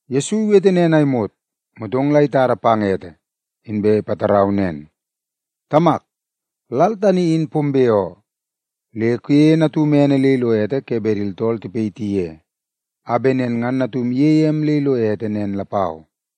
Yesu iwete nen a imot, motong la itada pang ete, inbe ipatarau nen, “Tamak, lal tani in pombe oo. Le kuyeie Natum ene le ilo ete ke bet di tooltool tipayiti ye, a bet nen ngan Natum iyeie em le ilo ete nen lapau.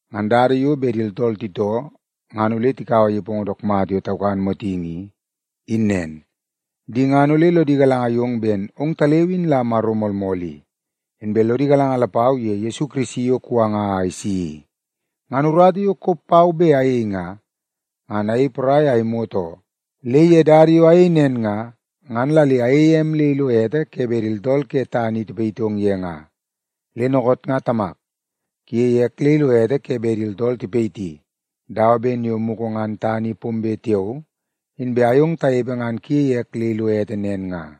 Ngan dada yo bet di tooltool titoo ngan ole tikaua nepongo dook mata yo taukan motingi i, in nen. Di ngan ole lodi galanga yong ben ongtaleu in la Maro moolmool i, inbe lodi galanga lapau ye Yesu Kirisi yo kuwanga a isi i. Ngan urata yo kop pau bet ayei nga, ngan ayei porai a imot oo. Le ye dada yo ayei nen nga, ngan la le ayeie em le ilo ete ke bet di tooltool ke tana i tipayitong ye nga. Le dookoot nga Tamak, kuyeie ek le ilo ete ke bet di tooltool tipayiti, dawa ben yo mugu ngan tana i pombe tiao inbe ayong tanepe ngan kuyei ek le ilo ete nen nga.”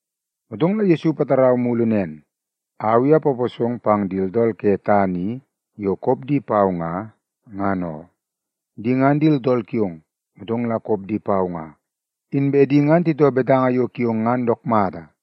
Motong la Yesu ipatarau mulu nen, “Au i apaposong pang di tooltool ke tana i yo kop di pau nga, ngan oo. Di ngan di tooltool kiong, motong la kop di pau nga. Inbe di ngan titoo betanga yo kiong ngan dook mata.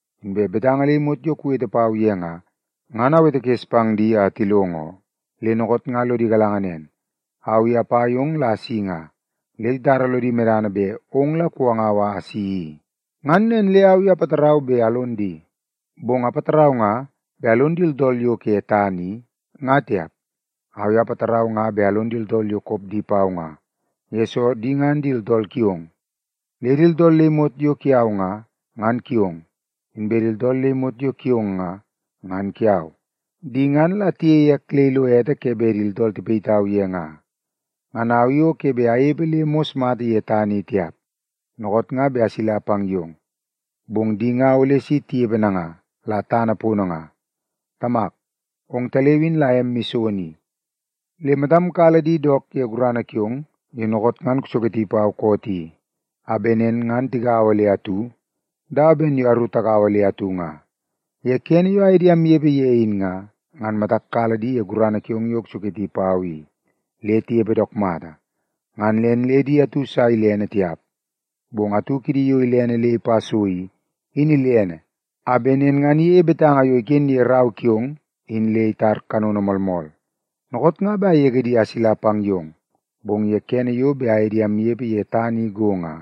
Inbe betanga le imot yo kuwete pau ye nga, ngan awetekes pang di a tilongo oo. Le dookoot nga lodi galanga nen, au i apa yong la asi nga, le titara lodi medana bet ong la kuwangau a asi i. “Ngan nen le au i apatarau bet alon di. Bong apatarau nga bet alon di tooltool yo ke tana i, nga tiap. Au i apatarau nga bet alon di tooltool yo kop di pau nga, yesoo di ngan di tooltool kiong. Le di tooltool le imot yo kiau nga, ngan kiong, inbe di tooltool le imot yo kiong nga, ngan kiau. Di ngan la tiyeie ek le ilo ete ke bet di tooltool tipayitau ye nga. Ngan au i o ke bet anepe le mos mata ye tana i tiap, dookoot nga bet asila pang yong. Bong di nga ole si tinepe nanga la tana pono nga. Tamak, ongtaleu in la em mison i, le matam kala di dook ye gurana kiong yo dookoot ngan kusuketi pau koot i, a bet nen ngan tigaua le atu, dawa ben yo aru tagaua le atu nga. Ye kene yo aye di amnepe ye in nga, ngan matak kala di ye gurana kiong yo kusuketi pau i, le tinepe dook mata. Ngan nen le di atu sa ilene tiap, bong atu kidi yo ilene le ipa so i, in ilene a bet nen ngan iyeie betanga yo iken ye Rau kiong in le itar kanono moolmool. “Dookoot nga bet agege di a asila pang yong, bong ye kene yo bet aye di amnepe ye tana i go nga,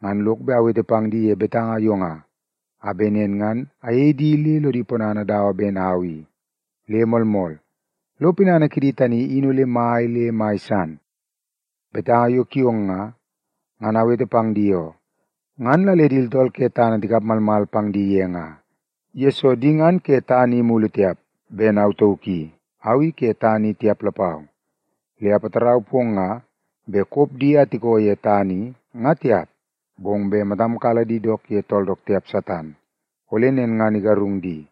ngan lok bet awete pang di ye betanga yo nga, a bet nen ngan ayei di le lodi ponana dawa ben au i. Le moolmool, lo ponana kidi tani in ole mai le mai san. Betanga yo kiong nga, ngan awete pang di oo. Ngan la le di tooltool ke tana i tikap malmal pang di ye nga, yesoo di ngan ke tana i mulu tiap, ben au tauk i, au i ke tana i tiap lapau. Le apatarau pong nga bet kop di a tikoo ye tana i, nga tiap, bong bet matam kala di dook ye tool dook tiap Satan, ole nen ngan igarung di.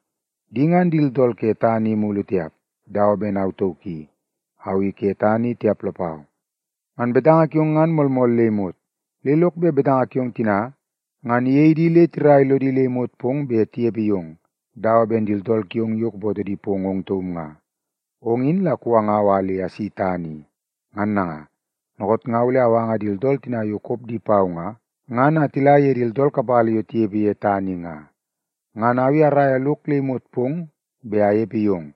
Di ngan di tooltool ke tana i mulu tiap, dawa ben au tauk i, au i ke tana i tiap lapau. Ngan betanga kiong ngan moolmool le imot, le lok bet betanga kiong tina ngan iyei di le tirai lodi le imot pong bet tinepe yong dawa ben di tooltool kiong yo kupootoo di pong ong taum nga. Ong in la kuwangau a le asi tana i. Ngan nanga, dookoot nga ole awanga di tooltool tina yo kop di pau nga, ngan a tila ye di tooltool kapala yo tinepe ye tana i nga. Ngan au i araia lok le imot pong bet anepe yong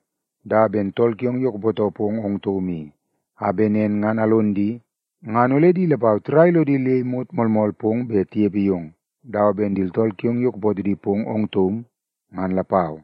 dawa ben tool kiong yo kupootoo pong ong taum i, a bet nen ngan alon di ngan ole di lapau tirai lodi le imot moolmool pong bet tinepe yong dawa ben di tooltool kiong yo kupootoo pong ong taum, ngan lapau.”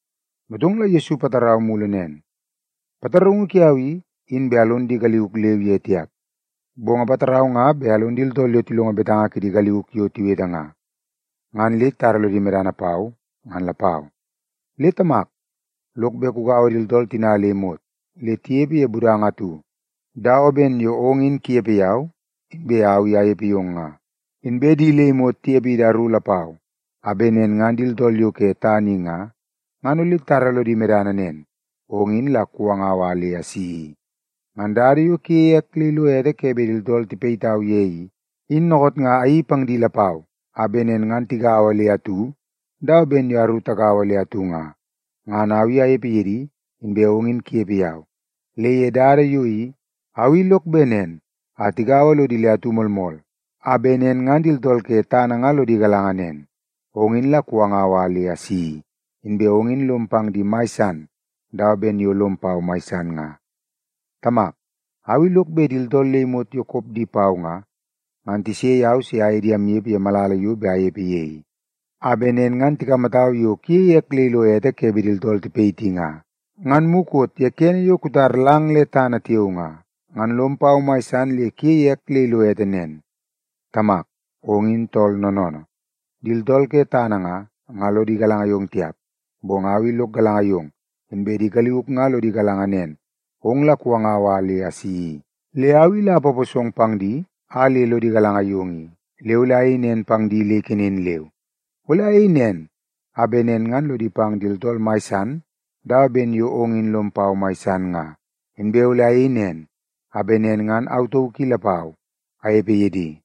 Motong la Yesu ipatarau mulu nen, “Pataraungu kiau i, in bet alon di galiuk leu ye tiap, bong apatarau nga bet alon di tooltool yo tilongo betanga kidi galiuk yo tiwete nga, ngan le titara lodi medana pau, ngan lapau. Le Tamak lok bet kugaua di tooltool tina le imot, le tinepe ye budanga atu, dawa ben yo ong in kunepe yau, inbe au i anepe yong nga. Inbe di le imot tinepe yidi aru lapau, a bet nen ngan di tooltool yo ke tana i nga, ngan ole titara lodi medana nen, ong in la kuwangau a le asi i. Ngan dada yo kuyeie ek le ilo ete ke bet di tooltool tipayitau ye i, in dookoot nga ayeii pang di lapau, a bet nen ngan tigaua le atu, dawa ben yo aru tagaua le atu nga. Ngan au i anepe ye di, inbe ong in kunepe yau. Le ye dada yo i, au i lok bet nen a tigaua lodi le atu moolmool, a bet nen ngan di tooltool ke tana nga lodi galanga nen, ong in la kuwangau a le asi i, inbe ong in lom pang di mai san dawa ben yo lom pau mai san nga. “Tamak, au i lok bet di tooltool le imot yo kop di pau nga, ngan tise yau se aye di amnepe ye malala yo bet anepe ye i, a bet nen ngan tikamatau yo kuyeie ek le ilo ete ke bet di tooltool tipayiti nga. Ngan mukot ye kene yo kutar lang le tana tiao nga, ngan lom pau mai san le kuyeie ek le ilo ete nen. “Tamak, ong in tool noonoonoo. Di tooltool ke tana nga, ngan lodi galanga yong tiap. Bong au i lok galanga yong, inbe di galiuk nga lodi galanga nen, ong la kuwangau a le asi i. Le au i la apaposong pang di a le lodi galanga yong i, le ole ayei nen pang di le ikenen leu. Ole ayei nen a bet nen ngan lodi pang di tooltool mai san dawa ben yo ong in lom pau mai san nga. Inbe ole ayei nen a bet nen ngan au tauk i lapau, anepe ye di.”